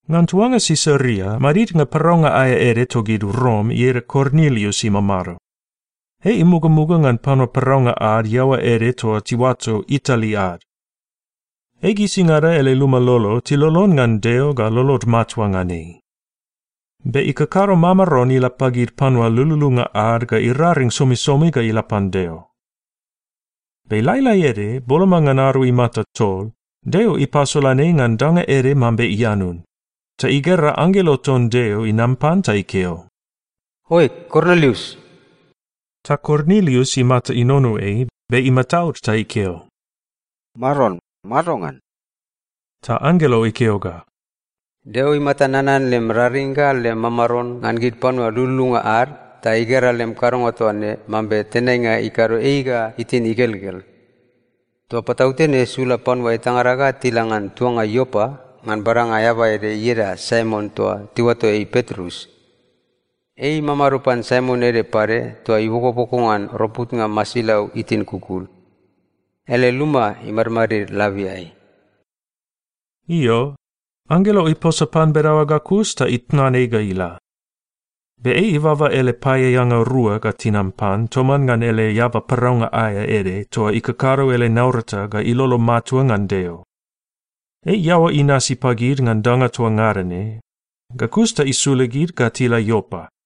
Ngan tuanga Sisaria madidnga paraunga aea ede togid Rom ieda Kornilius imamado. Ei imugamuga ngan panua paraunga ad iaoa ede toa tiuato Itali ad. Ei gisingada ele luma lolo tilolon ngan Deo ga lolod matua ngan ei. Be ikakado mamaron ila pagid panua lululunga ad ga iraring somisomi ga ila pan Deo. Be lailai ede boloma ngan ado imata tol, Deo ipasolan ei ngan danga ede mambe ianun, ta igera anggelo ton Deo inam pan ta ikeo, “Oe, Kornilius.” Ta Kornilius imata inono ei, be imataud ta ikeo, “Maron, madongan?” Ta anggelo ikeo ga, “Deo imata nanan lem raring ga lem mamaron ngan gid panua lululunga ad ta igera lem kadonga toa ne mambe tenainga ikado ei ga itin igelgel. Toa patautene sula panua etangada ga tila ngan tuanga Iopa ngan badanga eaba ede ieda Saimon toa tiuato ei Petrus. Ei imamado pan Saimon ede pade toa ibokoboko ngan roputnga masilau itin kukul. Ele luma imadmadid labiai.” Io, anggelo iposa pan bedaoa ga kus ta itnan ei ga ila. Be ei ibaba ele paeaeanga rua ga tinam pan toman ngan ele eaba paraunga aea ede toa ikakado ele naurata ga ilolo matua ngan Deo. Ei iaoa inasi pagid ngan danga toa ngada ne, ga kus ta isula gid ga tila Iopa.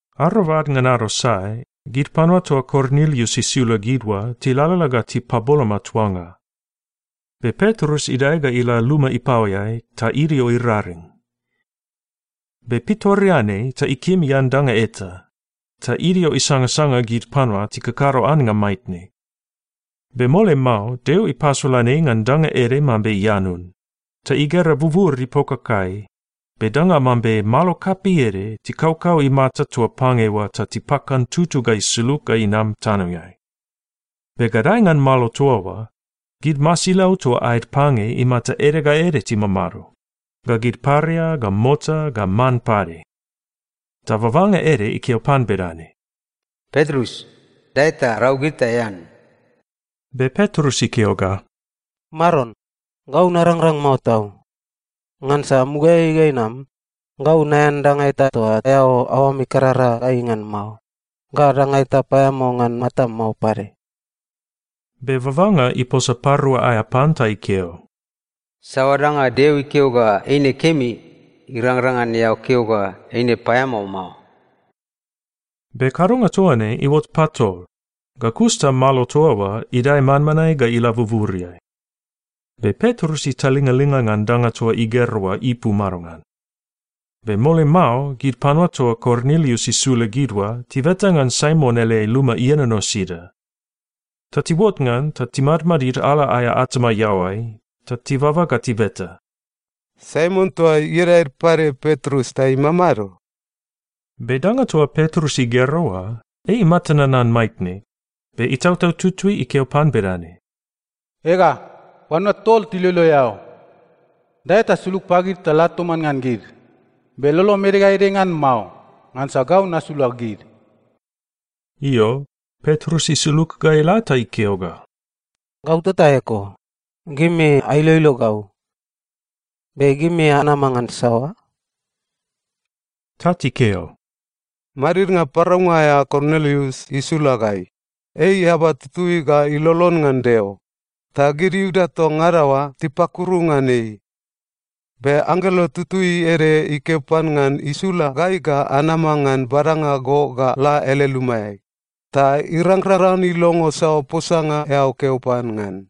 Arobad ngan ado sae, gid panua toa Kornilius isula gid oa tilalala ga tipaboloma tuanga. Be Petrus idae ga ila luma ipaoeai ta idio iraring. Be pitoreanei ta ikim ian danga eta, ta idio isangsanga gid panua tikakado annga maitne. Be mole mao Deo ipasolan ei ngan danga ede mambe ianun, ta igera bubur ipokakai, be danga mambe malo kapei ede tikaukau imata toa pange oa ta tipakantutu ga isulug ga inam tanoeai. Be gadae ngan malo toa oa, gid masilau toa aed pange imata ede ga ede timamado, ga gid paria ga mota, ga man pade. Ta babanga ede ikeo pan bedane, “Petrus, dae ta rau gid ta ean.” Be Petrus ikeo ga, “Maron, gau narangrang mao tau! Ngansa mugaeai ga inam, gau naean danga eta toa aoam ikarara gai ngan mao, ga danga eta paeamao ngan matam mao pade.” Be babanga iposa parua aea pan ta ikeo, “Saoa danga Deo ikeo ga eine kemi, irangrang ngan eao keo ga eine paeamao mao.” Be kadonga toa ne iuot patol, ga kus ta malo toa oa idae manmanae ga ila buburiai. Be Petrus italingalinga ngan danga toa igera oa ipu madongan. Be mole mao gid panua toa Kornilius isula gid oa tibeta ngan Saimon ele luma ienono sida. Ta tiuot ngan ta timadmadid ala aea atama iaoai, ta tibaba ga tibeta, “Saimon toa ieda ede pade Petrus ta imamado?” Be danga toa Petrus igera oa, ei imata nanan maitne, be Itautau Tutui ikeo pan bedane, “Ega, panua tol tiloilo eao. Dae ta sulug pagid ta la toman ngan gid. Be lolom ede ga ede ngan mao, ngansa gau nasula gid.” Io, Petrus isulug ga ila ta ikeo ga, “Gau tota eko, gimi ailoilo gau. Be gimi anama ngan saoa?” Ta tikeo, “Madidnga paraunga aea Kornilius isula gai. Ei eaba tutui ga ilolon ngan Deo, ta gid Iuda toa ngada oa tipakuru ngan ei. Be anggelo tutui ede ikeo pan ngan isula gai ga anama ngan badanga go ga la ele lumaeai, ta irangrang ngan ilongo saoa posanga eao keo pan ngan.”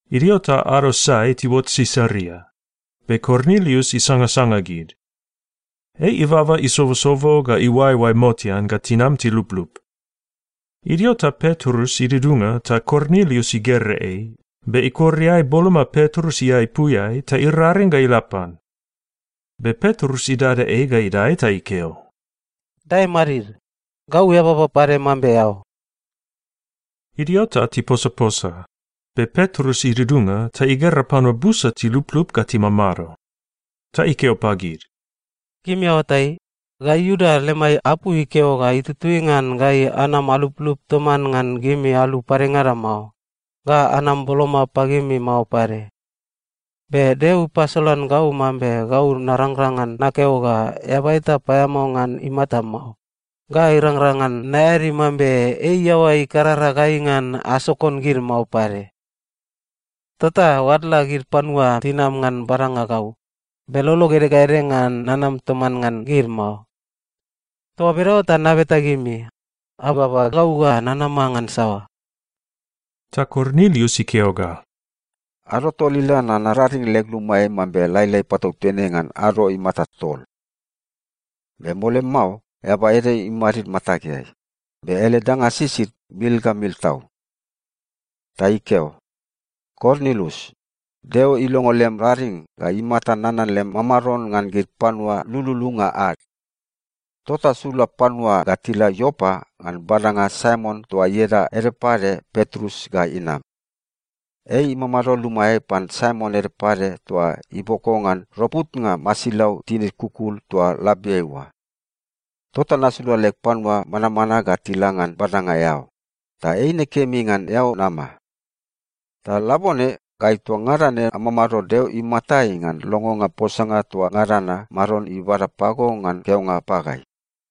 Idio ta ado sae tiuot Sisaria, be Kornilius isangasanga gid. Ei ibaba isobosobo ga iuaeoae motean ga tinam tiluplup. Idio ta Petrus idudunga ta Kornilius igera ei, be ikor iae boloma Petrus iaepuiai ta iraring ga ila pan. Be Petrus idada ei ga idae ta ikeo, “Dae madid. Gau eababa pade mambe eao.” Idio ta tiposaposa, be Petrus idudunga ta igera panua busa tiluplup ga timamado. Ta ikeo pagid, “Gimi aoatai, gai Iuda lemai apu ikeo ga itutui ngan gai anam aluplup toman ngan gimi alu padengada mao, ga anam boloma pagimi mao pade. Be Deo ipasolan gau mambe gau narangrang ngan nakeo ga eaba eta paeamao ngan imata mao, ga irangrang ngan naeadi mambe ei iaoa ikarara gai ngan asokon gid mao pade. Tota oadla gid panua tinam ngan badanga gau, be lolog ede ga ede ngan nanam toman ngan gid mao. Toa bedaoa ta nabeta gimi, ababa gau ga nanama ngan saoa?” Ta Kornilius ikeo ga, “Ado tol ila na, nararing leg lumaeai mambe lailai patautene ngan ado imata tol. Be mole mao eaba ede imadid matageai, be ele danga sisid mil ga mil tau. Ta ikeo, ‘Kornilius, Deo ilongo lem raring ga imata nanan lem mamaron ngan gid panua lululunga ad. Tota sula panua ga tila Iopa ngan badanga Saimon toa ieda ede pade Petrus ga inam. Ei imamado lumaeai pan Saimon ede pade toa iboko ngan roputnga masilau tinid kukul toa labiai oa.’ Tota nasula leg panua manmanae ga tila ngan badanga eao, ta eine kemi ngan eao nama. Ta labone, gai toa ngada ne amamado Deo imatai ngan longonga posanga toa ngada na Maron ibada pago ngan keonga pagai.”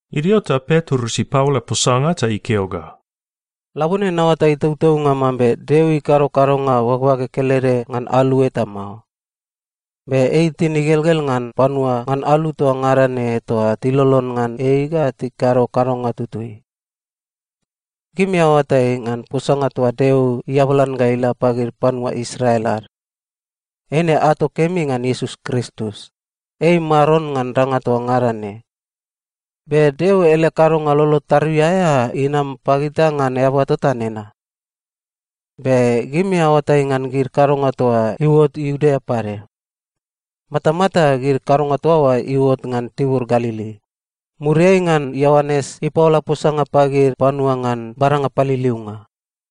Idio ta Petrus ipaola posanga ta ikeo ga, “Labone naoatai tautaunga mambe Deo ikado kadonga bagbage kelede ngan alu eta mao. Be ei itin igelgel ngan panua ngan alu toa ngada ne toa tilolon ngan ei ga tikado kadonga tutui. Gimi aoatai ngan posanga toa Deo iabalan ga ila pagid panua Israel ad. Eine ato kemi ngan Iesus Kristus, ei Maron ngan danga toa ngada ne, be Deo ele kadonga lolo tarui aea inam pagita ngan eaba tota nena. Be gimi aoatai ngan gid kadonga toa iuot Iudea pade. Matamata gid kadonga toa oa iuot ngan tibur Galili, muriai ngan Ioanes ipaola posanga pagid panua ngan badanga paliliunga.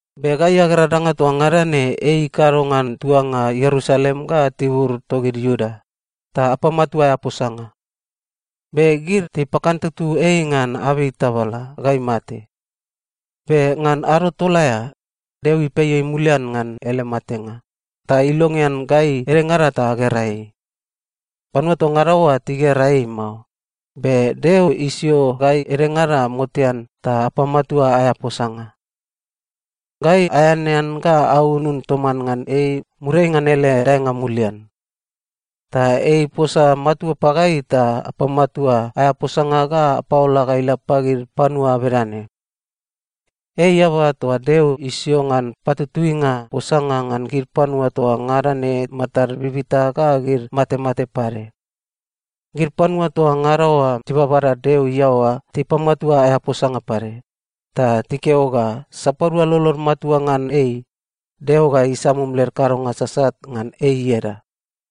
“Be gai agera danga toa ngada ne ei ikado ngan tuanga Ierusalem ga tibur togid Iuda, ta apamatua aea posanga. Be gid tipakantutu ei ngan abei tabala ga imate. Be ngan ado tol aea, Deo ipei ei mulian ngan ele matenga, ta ilongean gai edengada ta agera ei. Panua toa ngada oa tigera ei mao, be Deo isio gai edengada motean ta apamatua aea posanga. Gai aeanean ga aunun toman ngan ei muriai ngan ele daenga mulian. Ta ei iposa matua pagai ta apamatua aea posanga ga apaola ga ila pagid panua bedane: Ei eaba toa Deo isio ngan patutuinga posanga ngan gid panua toa ngada ne matad bibita ga gid matemate pade. Gid panua toa ngada oa tibabada Deo iaoa tipamatua aea posanga pade, ta tikeo ga sapadua lolod matua ngan ei, Deo ga isamum led kadonga sasat ngan ei ieda.”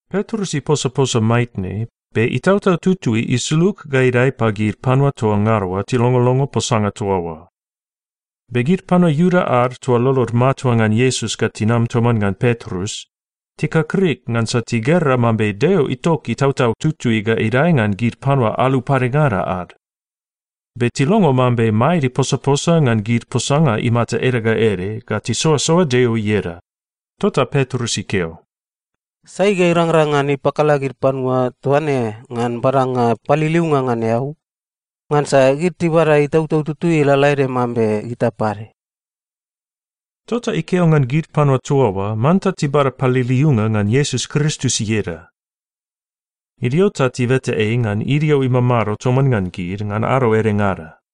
Petrus iposaposa maitne, be Itautau Tutui isulug ga idae pagid panua toa ngada oa tilongolongo posanga toa oa. Be gid panua Iuda ad toa lolod matua ngan Iesus ga tinam toman ngan Petrus, tikakrik ngansa tigera mambe Deo itok Itautau Tutui ga idae ngan gid panua alu padengada ad. Be tilongo mambe maed iposaposa ngan gid posanga imata ede ga ede ga tisoasoa Deo ieda. Tota Petrus ikeo, “Sai ga irangrang ngan ipakala gid panua toa ne ngan badanga paliliunga ngan eau? Ngansa gid tibada Itautau Tutui lalaede mambe gita pade.” Tota ikeo ngan gid panua toa oa manta tibada paliliunga ngan Iesus Kristus ieda. Idio ta tibeta ei ngan idio imamado toman ngan gid ngan ado edengada.